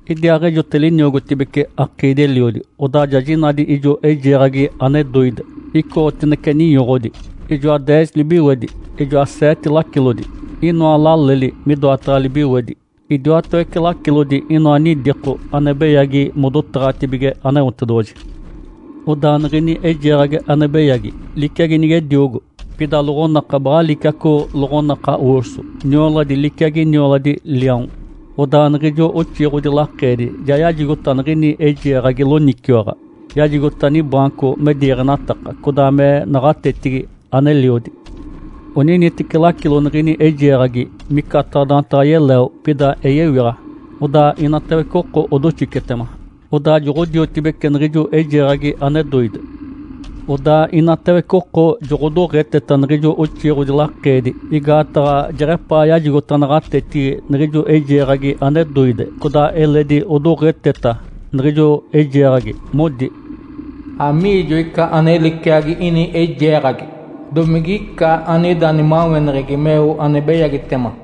Idiaaɡ̶ejote liniogotibece akiidi-eliodi. Odaa ja jinadi ijo eijeeɡ̶agi ane doide, icoɡ̶otinece ninyoɡ̶odi. Ijoa deez libiwedi, idiaa seete lacilodi. Inoa laleli midoataɡ̶a libiwedi. Idiwatawece lacilodi inoa nidiko ane beyagi modotaɡ̶atibige Aneotedoɡ̶oji. Odaa niɡ̶ini eijeeɡ̶agi ane beyagi liciagi nigediogo. Pida loɡ̶onaka baɡ̶a liciaco loɡ̶onaka “urso”. Nioladi liciagi nioladi liaon. Odaa niɡ̶ijo oxiiɡ̶odi lakeedi ja yajigota niɡ̶ini eijeeɡ̶agi loniciwaɡ̶a, yajigota nibaanco me diiɡ̶enataka, codaa me naɡ̶atetigi aneliodi. Oniniteci lacilo niɡ̶ini eijeeɡ̶agi micataɡ̶a daantaɡ̶a yeleo, pida eyewiɡ̶a. Odaa inatawece oko odoxicetema, odaa joɡ̶odiotibeci niɡ̶ijo eijeeɡ̶agi ane doide. Odaa inatawece oko joɡ̶odoɡ̶eteta niɡ̶ijo oxiiɡ̶odi lakeedi igaataɡ̶a jeɡ̶epaa yajigota naɡ̶atetigi niɡ̶ijo eijeeɡ̶agi ane doide. Codaa eledi odoɡ̶eteta niɡ̶ijo eijeeɡ̶agi, modi, “Amiijo ica ane liciagi ini eijeeɡ̶agi? Domigica anida nimaweneɡ̶egi meo ane beyagitema?”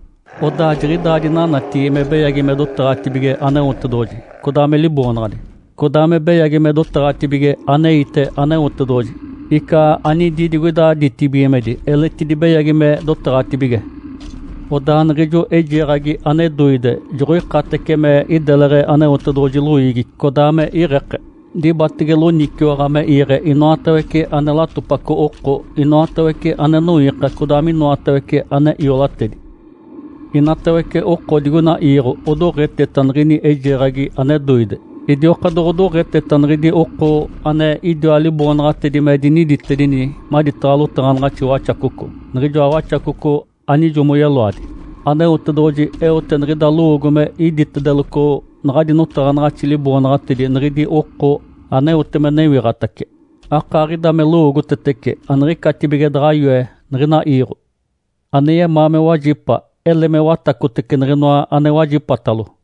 Odaa jiɡ̶idaa dinanatigi me beyagi me dotaɡ̶atibige Aneotedoɡ̶oji, codaa me Liboonaɡ̶adi, codaa me beyagi me dotaɡ̶atibige aneite Aneotedoɡ̶oji, ica anidi digoida ditibigimedi eletidi beyagi me dotaɡ̶atibige. Odaa niɡ̶ijo eijeeɡ̶agi ane doide joɡ̶oikatece me ideleɡ̶e Aneotedoɡ̶oji loiigi, codaa me iɡ̶eke. Dibatege loniciwaɡ̶a me iiɡ̶e inoatawece ane latopaco oko, inoatawece ane noiika, codaa minoatawece ane iolatedi. Inatawece oko digoina iiɡ̶o odoɡ̶eteta niɡ̶ini eijeeɡ̶agi ane doide. Idioka doɡ̶odoɡ̶eteta niɡ̶idi oko ane idiwa liboonaɡ̶atedi me diniditedini maditaɡ̶a lotaɡ̶anaɡ̶axi Waxacoco, niɡ̶ijoa Waxacoco anijo moyeloadi. Aneotedoɡ̶oji eote niɡ̶ida lowoogo me iditedeloco naɡ̶adi notaɡ̶anaɡ̶axi liboonaɡ̶atedi niɡ̶idi oko aneote me newiɡ̶atace. Akaaɡ̶ida me lowoogotetece aniɡ̶icatibige daɡ̶a yoe niɡ̶ina iiɡ̶o. Ane yemaa me wajipa, ele me watacotece niɡ̶inoa ane wajipatalo.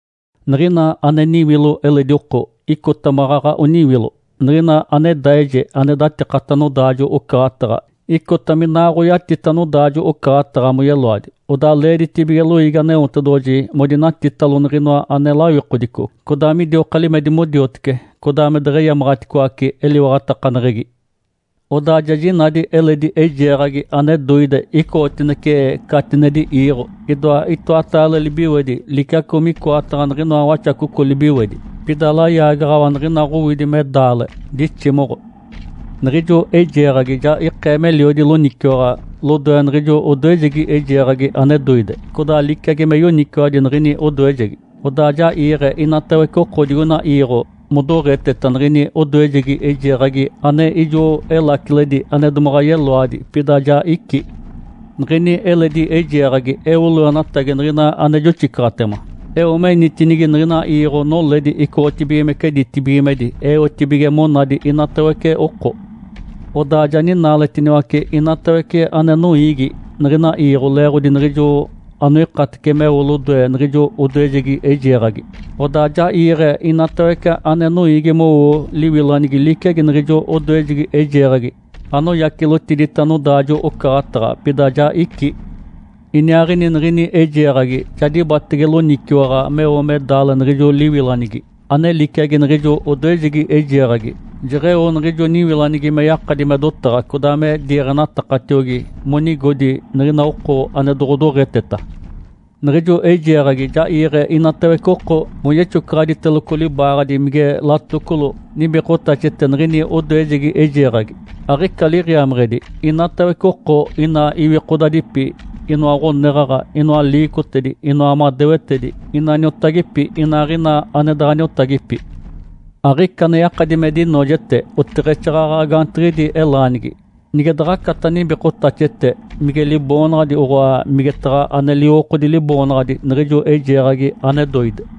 Niɡ̶ina ane niwilo eledi oko, icota maɡ̶aɡ̶a oniwilo. Niɡ̶ina ane daije ane datikata nodaajo-ocaɡ̶ataɡ̶a, icota minaaɡ̶oyatita nodaajo-ocaɡ̶ataɡ̶a moyeloadi. Odaa leeditibige loiigi Aneotedoɡ̶oji modinatitalo niɡ̶inoa ane lawikodico, codaa midioka limedi modiotece, codaa me deɡ̶eyamaɡ̶aticoace eliwaɡ̶atakaneɡ̶egi. Odaa ja jinadi eledi eijeeɡ̶agi ane doide icoɡ̶otinece catinedi iiɡ̶o. Idoa itoataale libiwedi liciaco micoataɡ̶a niɡ̶inoa waxacoco libiwedi. Pida layaagaɡ̶awa niɡ̶ina Ǥowidi me daale, diximoɡ̶o. Niɡ̶ijo eijeeɡ̶agi ja ikee meliodi loniciwaɡ̶a lodoe niɡ̶ijo odoejegi eijeeɡ̶agi ane doide, codaa liciagi me yoniciwadi niɡ̶ini odoejegi. Odaa ja iiɡ̶e inatawece oko digoina iiɡ̶o modoɡ̶eteta niɡ̶ini odoejegi eijeeɡ̶agi ane ijo elaciledi ane domaɡ̶a yeloadi, pida ja icí. Niɡ̶ini eledi eijeeɡ̶agi eo loenatagi niɡ̶ina ane joxicaɡ̶atema, eo menitinigi niɡ̶ina iiɡ̶o noledi icoɡ̶otibigimece ditibigimedi, eotibige monadi inatawece oko. Odaa ja ninaaletiniwace inatawece ane noiigi niɡ̶ina iiɡ̶o leeɡ̶odi niɡ̶ijo anoikatece meo lodoe niɡ̶ijo odoejegi eijeeɡ̶agi. Odaa ja iiɡ̶e inatawece ane noiigi mowo liwilanigi liciagi niɡ̶ijo odoejegi eijeeɡ̶agi anoyacilotidita nodaajo-ocaɡ̶ataɡ̶a, pida ja icí. Iniaaɡ̶ini niɡ̶ini eijeeɡ̶agi ja dibatege loniciwaɡ̶a meo me daale niɡ̶ijo liwilanigi ane liciagi niɡ̶ijo odoejegi eijeeɡ̶agi, jeɡ̶eo niɡ̶ijo niwilanigi me yakadi me dotaɡ̶a, codaa me diiɡ̶enatakatiogi monigodi niɡ̶ina oko ane doɡ̶odoɡ̶eteta. Niɡ̶ijo eijeeɡ̶agi ja iiɡ̶e inatawece oko moyexocaɡ̶aditeloco libaaɡ̶adi mige latocolo nibikotaxete niɡ̶ini odoejegi eijeeɡ̶agi, aɡ̶ica liɡ̶iameɡ̶edi inatawece oko, ina iwikodadipi, inoa ɡ̶oneɡ̶aɡ̶a, inoa liicotedi, inoa madewetedi, ina niotagipi, inaaɡ̶ina ane daɡ̶a niotagipi. Aɡ̶ica ane yakadi me dinoojete oteɡ̶exaaɡ̶aɡ̶a gaantiɡ̶idi elaanigi, nige daɡ̶acata nibikotaxete, mige liboonaɡ̶adi, oɡ̶oa, migetaɡ̶a ane liwokodi liboonaɡ̶adi niɡ̶ijo eijeeɡ̶agi ane doide.